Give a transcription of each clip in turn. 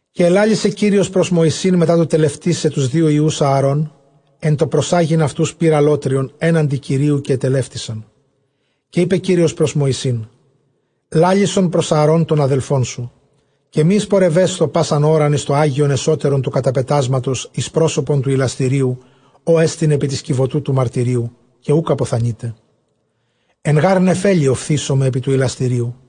Καὶ ἐλάλησε Κύριος πρὸς Μωυσῆν, μετὰ τὸ τελευτῆσαι τοὺς δύο υἱοὺς Ἀαρὼν ἐν τῷ προσάγειν αὐτοὺς πῦρ ἀλλότριον ἔναντι Κυρίου, καὶ ἐτελεύτησαν. Καὶ εἶπε Κύριος πρὸς Μωυσῆν, λάλησον πρὸς Ἀαρὼν τὸν ἀδελφόν σου, καὶ μὴ εἰσπορευέσθω πᾶσαν ὥραν εἰς τὸ ἅγιον ἐσώτερον τοῦ καταπετάσματος εἰς πρόσωπον τοῦ ἱλαστηρίου, ὅ ἐστιν ἐπὶ τῆς κιβωτοῦ τοῦ μαρτυρίου, καὶ οὐκ ἀποθανεῖται· ἐν γὰρ νεφέλῃ ὀφθήσομαι ἐπὶ τοῦ ἱλαστηρίου.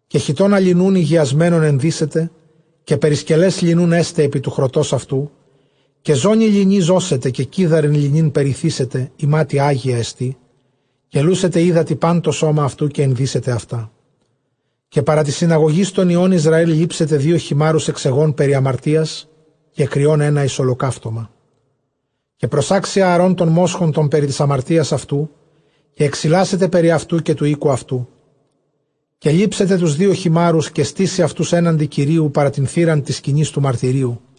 Καὶ χιτῶνα λινοῦν ἡγιασμένον ἐνδύσεται, καὶ περισκελὲς λινοῦν ἔσται ἐπὶ τοῦ χρωτὸς αὐτοῦ, καὶ ζώνῃ λινῇ ζώσεται, καὶ κίδαριν λινῆν περιθήσεται, ἱμάτια ἅγιά ἐστι· καὶ λούσεται ὕδατι πᾶν τὸ σῶμα αὐτοῦ καὶ ἐνδύσεται αὐτά. Καὶ παρὰ τῆς συναγωγῆς τῶν υἱῶν Ἰσραὴλ λήψεται δύο χιμάρους ἐξ αἰγῶν περὶ ἁμαρτίας, καὶ κριὸν ἕνα εἰς ὁλοκαύτωμα. Καὶ προσάξει Ἀαρὼν τὸν μόσχον τὸν περὶ τῆς ἁμαρτίας αὐτοῦ, καὶ ἐξιλάσεται περὶ αὐτοῦ, καὶ τοῦ οἴκου αὐτοῦ. Καὶ λήψεται τοὺς δύο χιμάρους, καὶ στήσει αὐτοὺς ἔναντι Κυρίου παρὰ τὴν θύραν τῆς σκηνῆς τοῦ μαρτυρίου.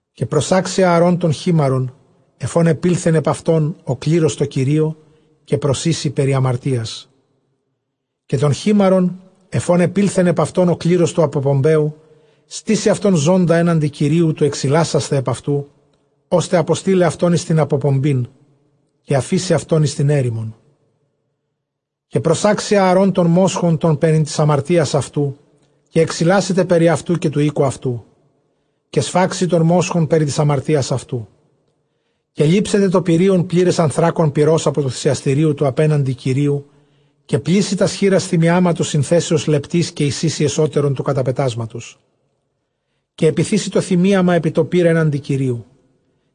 Καὶ προσάξει Ἀαρὼν τὸν χίμαρον ἐφʼ ὃν ἐπῆλθεν ἐπʼ αὐτὸν ὁ κλῆρος τῷ Κυρίῳ, καὶ προσοίσει περὶ ἁμαρτίας. Καὶ τὸν χίμαρον, ἐφʼ ὃν ἐπῆλθεν ἐπʼ αὐτὸν ὁ κλῆρος τοῦ ἀποπομπαίου, στήσει αὐτὸν ζῶντα ἔναντι Κυρίου, τοῦ ἐξιλάσασθαι ἐπʼ αὐτοῦ, ὥστε ἀποστεῖλαι αὐτὸν εἰς τὴν ἀποπομπήν, καὶ ἀφήσει αὐτὸν εἰς τὴν ἔρημον. Καὶ προσάξει Ἀαρὼν τὸν μόσχον τὸν περὶ τῆς ἁμαρτίας αὑτοῦ, καὶ ἐξιλάσεται περὶ ἑαυτοῦ, καὶ τοῦ οἴκου· καὶ σφάξει τὸν μόσχον περὶ τῆς ἁμαρτίας αὐτοῦ. Καὶ λήψεται τὸ πυρεῖον πλῆρες ἀνθράκων πυρὸς ἀπὸ τοῦ θυσιαστηρίου, τοῦ ἀπέναντι Κυρίου· καὶ πλήσει τὰς χεῖρας θυμιάματος συνθέσεως λεπτῆς, καὶ εἰσοίσει ἐσώτερον τοῦ καταπετάσματος. Καὶ ἐπιθήσει τὸ θυμίαμα ἐπὶ τὸ πῦρ ἔναντι Κυρίου·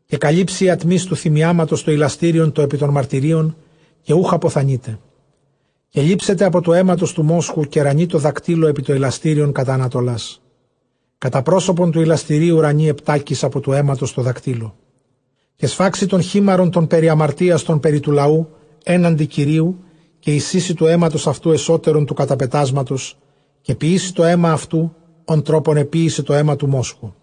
καὶ καλύψει ἡ ἀτμὶς τοῦ θυμιάματος τὸ ἱλαστήριον τὸ ἐπὶ τῶν μαρτυρίων, καὶ οὐκ ἀποθανεῖται. Καὶ λήψεται ἀπὸ τοῦ αἵματος τοῦ μόσχου, καὶ ῥανεῖ τῷ δακτύλῳ ἐπὶ τὸ ἱλαστήριον κατὰ ἀνατολάς· κατὰ πρόσωπον τοῦ ἱλαστηρίου ῥανεῖ ἑπτάκις ἀπὸ τοῦ αἵματος τῷ δακτύλῳ. Καὶ σφάξει τὸν χίμαρον τὸν περὶ ἁμαρτίας, τὸν περὶ τοῦ λαοῦ, ἔναντι Κυρίου· καὶ εἰσοίσει τοῦ αἵματος αὐτοῦ ἐσώτερον τοῦ καταπετάσματος, καὶ ποιήσει τὸ αἷμα αὐτοῦ, ὃν τρόπον ἐποίησε τὸ αἷμα τοῦ μόσχου·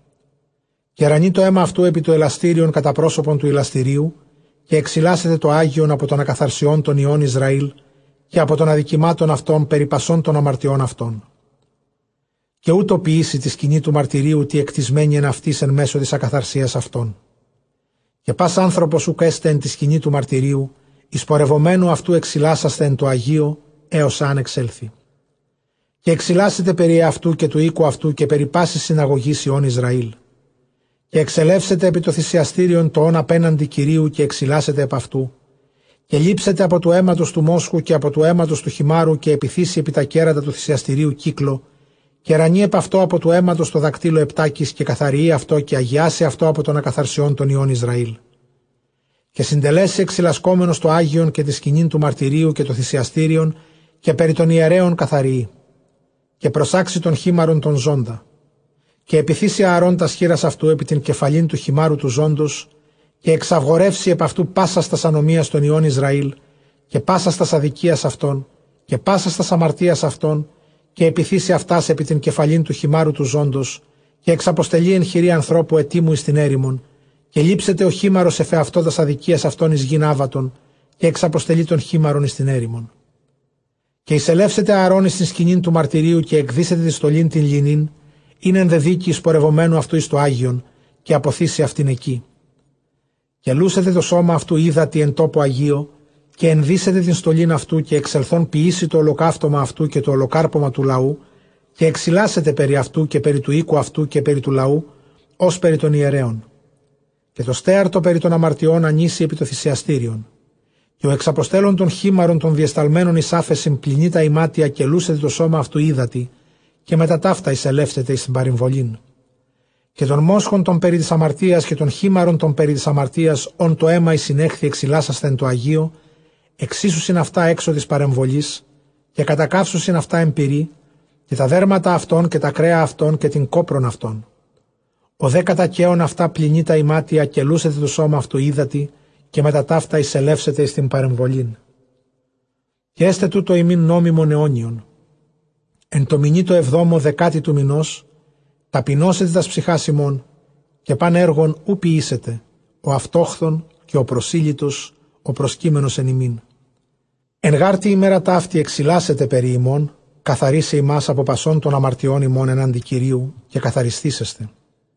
καὶ ῥανεῖ τὸ αἷμα αὐτοῦ ἐπὶ τὸ ἱλαστήριον, κατὰ πρόσωπον τοῦ ἱλαστηρίου. Καὶ ἐξιλάσεται τὸ ἅγιον ἀπὸ τῶν ἀκαθαρσιῶν τῶν υἱῶν Ἰσραὴλ, καὶ ἀπὸ τῶν ἀδικημάτων αὐτῶν περὶ πασῶν τῶν ἁμαρτιῶς αὐτῶν· καὶ οὕτω ποιήσει τῇ σκηνῇ τοῦ μαρτυρίου τῇ ἐκτισμένῃ ἐν αὐτοῖς ἐν μέσῳ τῆς ἀκαθαρσίας αὐτῶν. Καὶ πᾶς ἄνθρώπος οὐκ ἔσται ἐν τῇ σκηνῇ τοῦ μαρτυρίου, εἰσπορευομένου αὐτοῦ ἐξιλάσασθαι ἐν τῷ ἁγίῳ, ἕως ἂν ἐξέλθῃ· καὶ ἐξιλάσεται περὶ ἑαυτοῦ, καὶ τοῦ οἴκου αὐτοῦ, καὶ περὶ πάσης συναγωγῆς υἱῶν Ἰσραήλ. Καὶ ἐξελεύσεται ἐπὶ τὸ θυσιαστήριον τὸ ὂν ἀπέναντι Κυρίου, καὶ ἐξιλάσεται ἐπʼ αὐτοῦ· καὶ λήψεται ἀπὸ τοῦ αἵματος τοῦ μόσχου, καὶ ἀπὸ τοῦ αἵματος τοῦ χιμάρου, καὶ ἐπιθήσει ἐπὶ τὰ κέρατα τοῦ θυσιαστηρίου κύκλῳ. Καὶ ῥανεῖ ἐπʼ αὐτὸ ἀπὸ τοῦ αἵματος τῷ δακτύλῳ ἑπτάκις, καὶ καθαριεῖ αὐτό, καὶ ἁγιάσει αὐτὸ ἀπὸ τῶν ἀκαθαρσιῶν τῶν υἱῶν Ἰσραήλ. Καὶ συντελέσει ἐξιλασκόμενος τὸ ἅγιον, καὶ τὴν σκηνὴν τοῦ μαρτυρίου, καὶ τὸ θυσιαστήριον, καὶ περὶ τῶν ἱερέων καθαριεῖ· καὶ προσάξει τὸν χίμαρον τὸν ζῶντα. Καὶ ἐπιθήσει Ἀαρὼν τὰς χεῖρας αὐτοῦ ἐπὶ τὴν κεφαλὴν τοῦ χιμάρου τοῦ ζῶντος, καὶ ἐξαγορεύσει ἐπʼ αὐτοῦ πάσας τὰς ἀνομίας τῶν υἱῶν Ἰσραὴλ, καὶ πάσας τὰς ἀδικίας αὐτῶν, καὶ πάσας τὰς ἁμαρτίας αὐτῶν· καὶ ἐπιθήσει αὐτὰς ἐπὶ τὴν κεφαλὴν τοῦ χιμάρου τοῦ ζῶντος· καὶ ἐξαποστελεῖ ἐν χειρὶ ἀνθρώπου ἑτοιμου εἰς τὴν ἔρημον. Καὶ λήψεται ὁ χίμαρος ἐφʼ ἑαυτῷ τὰς ἀδικίας αὐτῶν εἰς γῆν ἄβατον· καὶ ἐξαποστελεῖ τὸν χίμαρον εἰς τὴν ἔρημον. Καὶ εἰσελεύσεται Ἀαρὼν εἰς τὴν σκηνὴν τοῦ μαρτυρίου, καὶ ἐκδύσεται τὴν στολὴν τὴν λινῆν, ἣν ἐνδεδύκει, εἰσπορευομένου αὐτοῦ εἰς τὸ ἅγιον, καὶ ἀποθήσει αὐτὴν ἐκεῖ. Καὶ λούσεται τὸ σῶμα αὐτοῦ ὕδατι ἐν τόπῳ ἁγίῳ, καὶ ἐνδύσεται τὴν στολὴν αὐτοῦ, καὶ ἐξελθὼν ποιήσει τὸ ὁλοκαύτωμα αὐτοῦ καὶ τὸ ὁλοκάρπωμα τοῦ λαοῦ, καὶ ἐξιλάσεται περὶ αὐτοῦ, καὶ περὶ τοῦ οἴκου αὐτοῦ, καὶ περὶ τοῦ λαοῦ, ὡς περὶ τῶν ἱερέων. Καὶ τὸ στέαρ τὸ περὶ τῶν ἁμαρτιῶν ἀνοίσει ἐπὶ τὸ θυσιαστήριον. Καὶ ὁ ἐξαποστέλλων τὸν χίμαρον τὸν διεσταλμένον εἰς ἄφεσιν, πλυνεῖ τὰ ἱμάτια, καὶ λούσεται τὸ σῶμα αὐτοῦ ὕδατι, καὶ μετὰ ταῦτα εἰσελεύσεται εἰς τὴν παρεμβολήν. Καὶ τὸν μόσχον τὸν περὶ τῆς ἁμαρτίας, καὶ τὸν χίμαρον τὸν περὶ τῆς ἁμαρτίας, ὧν τὸ αἷμα εἰσηνέχθη ἐξιλάσασθαι ἐν τῷ ἁγίῳ, ἐξοίσουσιν αὐτὰ ἔξω τῆς παρεμβολῆς, ταὶ κατακαύσουσιν αὐτὰ ἐν πυρὶ, καὶ τὰ δέρματα αὐτῶν καὶ τὰ κρέα αὐτῶν καὶ τὴν κόπρον αὐτῶν. Ὁ δὲ κατακαίων αὐτὰ, πλυνεῖ τὰ ἱμάτια, καὶ λούσεται τὸ σῶμα αὐτοῦ ὕδατι, καὶ μετὰ ταῦτα εἰσελεύσεται εἰς τὴν παρεμβολήν. Καὶ ἔσται τοῦτο ὑμῖν νόμιμον αἰώνιον· ἐν τῷ μηνὶ τῷ ἑβδόμῳ, δεκάτῃ τοῦ μηνὸς, ταπεινώσετε τὰς ψυχὰς ὑμῶν, καὶ πᾶν ἔργον οὐ ποιήσετε ὁ αὐτόχθων, καὶ ὁ προσήλυτος ὁ προσκείμενος ἐν ὑμῖν. Ἐν γὰρ τῇ ἡμέρᾳ ταύτῃ ἐξιλάσεται περὶ ὑμῶν, καθαρίσαι ὑμᾶς ἀπὸ πασῶν τῶν ἁμαρτιῶν ὑμῶν ἔναντι Κυρίου, καὶ καθαρισθήσεσθε.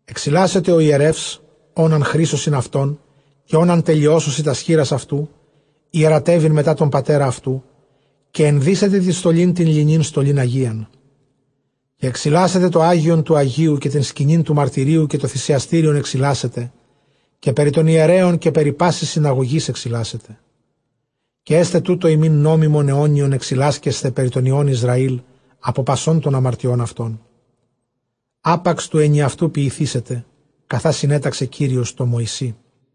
Ἐξιλάσεται ὁ ἱερεὺς, ὃν ἂν χρίσωσιν αὐτὸν, καὶ ὃν ἂν τελειώσωσι τὰς χεῖρας αὐτοῦ ἱερατεύειν μετὰ τὸν πατέρα αὐτοῦ· καὶ ἐνδύσεται τὴν στολὴν τὴν λινῆν, στολὴν ἁγίαν. Καὶ ἐξιλάσεται τὸ ἅγιον τοῦ ἁγίου, καὶ τὴν σκηνὴν τοῦ μαρτυρίου, καὶ τὸ θυσιαστήριον ἐξιλάσεται, καὶ περὶ τῶν ἱερέων, καὶ περὶ πάσης συναγωγῆς ἐξιλάσεται. Καὶ ἔσται τοῦτο ὑμῖν νόμιμον αἰώνιον ἐξιλάσκεσθαι περὶ τῶν νἱῶν Ἰσραὴλ ἀπὸ πασῶν τῶν ἁμαρτιῶν αὐτῶν· ἅπαξ τοῦ ἐνιαυτοῦ ποιηθήσεται, καθὰ συνέταξε Κύριος τῷ Μωυσῇ.